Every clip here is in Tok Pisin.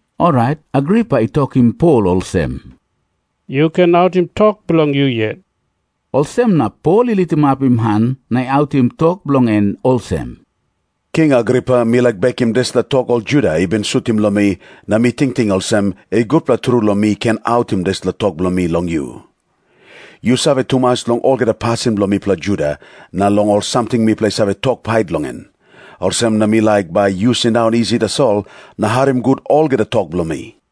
Orait Agripa i tokim Pol olsem, "Yu ken autim tok bilong yu yet." Olsem na Pol i litimapim han na i autim tok bilong en olsem, "King Agripa, mi laik bekim dispela tok ol Juda i bin sutim long mi, na mi tingting olsem, i gutpela tru long mi ken autim dispela tok bilong mi long yu. Yu save tumas long olgeta pasin bilong mipela Juda, na long ol samting mipela i save tok pait long en. Olsem na mi laik bai yu sindaun isi tasol na harim gut olgeta tok bilong mi.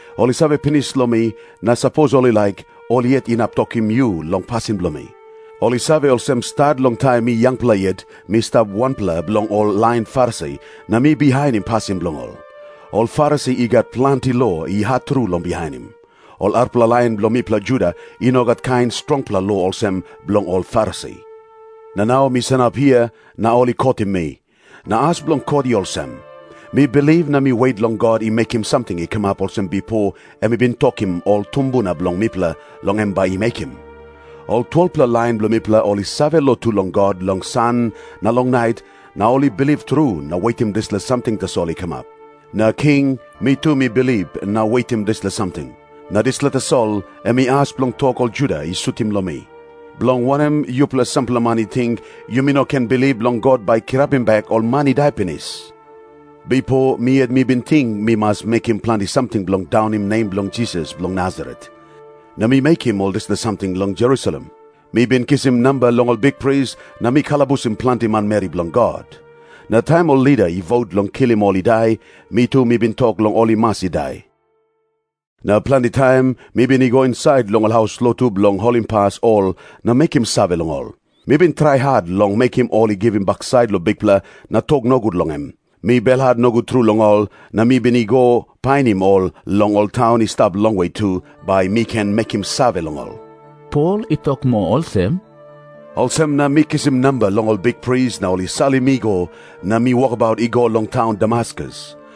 Ol i save pinis long mi, na sapos ol i laik, ol yet inap tokim yu long pasin bilong mi. Ol i save olsem, stat long taim mi yangpela yet mi stap wanpela bilong ol lain Farisi, na mi bihainim pasin bilong ol. Ol Farisi i gat planti lo i hat tru long bihainim. Ol arapela lain bilong mipela Juda i no gat kain strongpela lo olsem bilong ol Farisi. Na nau mi sanap hia, na ol i kotim mi. Na as bilong kot i olsem. Mi bilip na mi wet long God i mekim samting i kamap olsem bipo em i bin tokim ol tumbuna bilong mipela long em bai i mekim. Ol 12-pela lain bilong mipela ol i save lotu long God long san na long nait, na ol i bilip tru na wetim dispela samting tasol i kamap. Na king, mi tu mi bilip na wetim dispela samting. Na dispela tasol em i as bilong tok ol Juda i sutim long mi. Bilong wanem yupela sampela man i ting, yumi no ken bilip long God bai i kirapim bek ol man i dai pinis? "Bipo mi yet mi bin ting mi mas mekim planti samting bilong daunim nem bilong Jisas bilong Nasaret. Na mi mekim ol dispela samting long Jerusalem. Mi bin kisim namba long ol bikpris, na mi kalabusim planti manmeri bilong God. Na taim ol lida i vot long kilim ol i dai, mi tu mi bin tok long ol i mas i dai. Na planti taim mi bin i go insait long ol haus lotu bilong holimpas ol na mekim save long ol. Mi bin trai hat long mekim ol i givim baksait long Bikpela na tok nogut long em. Mi belhat nogut tru long ol, na mi bin i go painim ol long ol taun i stap longwe tu, bai mi ken mekim save long ol." Pol i tok moa olsem, "Olsem na mi kisim namba long ol bikpris na ol i salim mi i go, na mi wokabaut i go long taun Damaskus.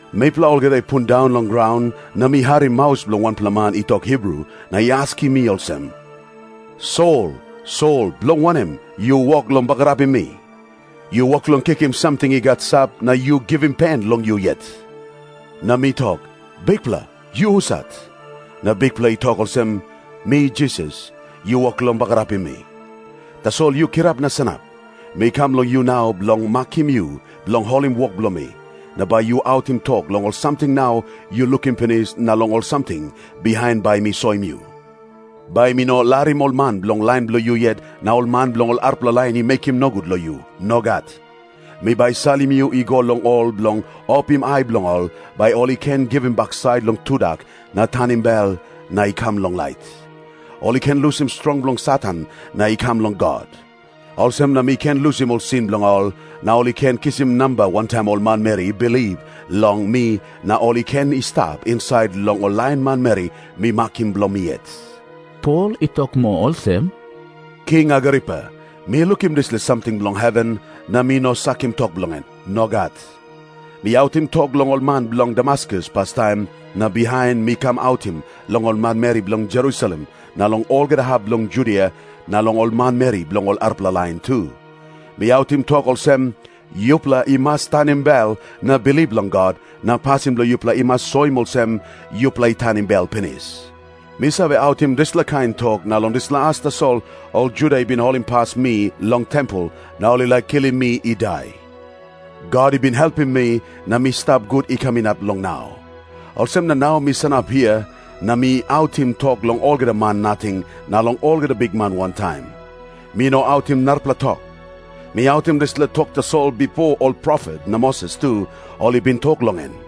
Mipela olgeta i pundaun long graun, na mi harim maus bilong wanpela man i tok Hibru na i askim mi olsem, 'Sol, Sol, bilong wanem yu wok long bagarapim mi? Yu wok long kikim samting i gat sap, na yu givim pen long yu yet.' Na mi tok, 'Bikpela, yu husat?' Na Bikpela i tok olsem, 'Mi Jisas, yu wok long bagarapim mi. Tasol yu kirap na sanap. Mi kam long yu nau bilong makim yu bilong holim wok bilong mi. Na bai yu autim tok long ol samting nau yu lukim pinis na long ol samting bihain bai mi soim yu. Bai mi no larim ol man bilong lain bilong yu yet na ol man bilong ol arapela lain i mekim nogut long yu. Nogat. Mi bai salim yu i go long ol bilong opim ai bilong ol, bai ol i ken givim baksait long tudak na tanim bel na i kam long lait. Ol i ken lusim strong bilong Satan na i kam long God. Olsem na mi ken lusim ol sin bilong ol, na ol i ken kisim namba wantaim ol manmeri i bilip long mi na ol i ken i stap insait long ol lain manmeri mi makim bilong mi yet.'" Pol i tok moa olsem, "King Agripa, mi lukim dispela samting bilong heven, na mi no sakim tok bilong en. Nogat. Mi autim tok long ol man bilong Damaskus pastaim, na bihain mi kam autim long ol manmeri bilong Jerusalem, na long olgeta hap bilong Judia, na long ol manmeri bilong ol arapela lain tu. Mi autim tok olsem, 'Yupela i mas tanim bel na bilip long God, na pasin bilong yupela i mas soim olsem yupela i tanim bel pinis.' Mi save autim dispela kain tok, na long dispela as tasol ol Juda i bin holimpas mi long tempel, na ol i laik kilim mi i dai. God i bin helpim mi na mi stap gut i kam inap long nau. Olsem na nau mi sanap hia, na mi autim tok long olgeta man nating na long olgeta bikman wantaim. Mi no autim narapela tok. Mi autim dispela tok tasol bipo ol profet na Moses tu ol i bin tok long en.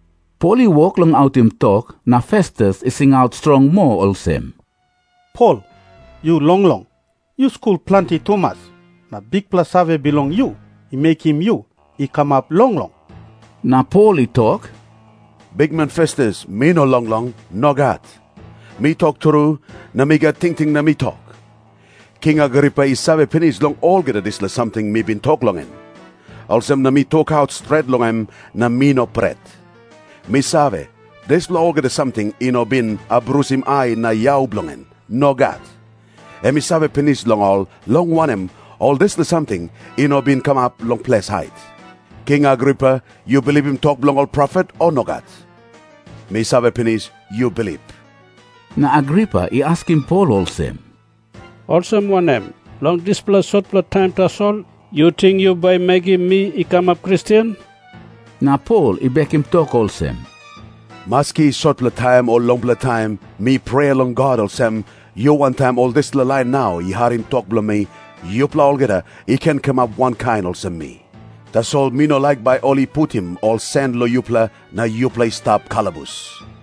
Pol i wok long autim tok, na Festus i singaut strong moa olsem, "Pol, yu longlong. Yu skul planti tumas, na bikpela save bilong yu i mekim yu i kamap longlong!" Na Pol i tok, "Bikman Festus, mi no longlong. Nogat. Mi tok tru, na mi gat tingting na mi tok. King Agripa i save pinis long olgeta dispela samting mi bin tok long en. Olsem na mi tokaut stret long em, na mi no pret. Mi save, dispela olgeta samting i no bin abrusim ai na yau bilong en. Nogat. Em i save pinis long ol, long wanem, ol dispela samting i no bin kamap long ples hait. King Agripa, yu bilipim tok bilong ol profet, o nogat? Mi save pinis, yu bilip." Na Agripa i askim Pol olsem, "Olsem wanem? Long dispela sotpela taim tasol, yu ting yu bai mekim mi i kamap Kristen?" Na Pol i bekim tok olsem, "Maski sotpela taim o longpela taim, mi prea long God olsem, yu wantaim ol dispela lain nau i harim tok bilong mi, yupela olgeta i ken kamap wankain olsem mi. Tasol mi no laik bai ol i putim ol sen long yupela na yupela i stap kalabus."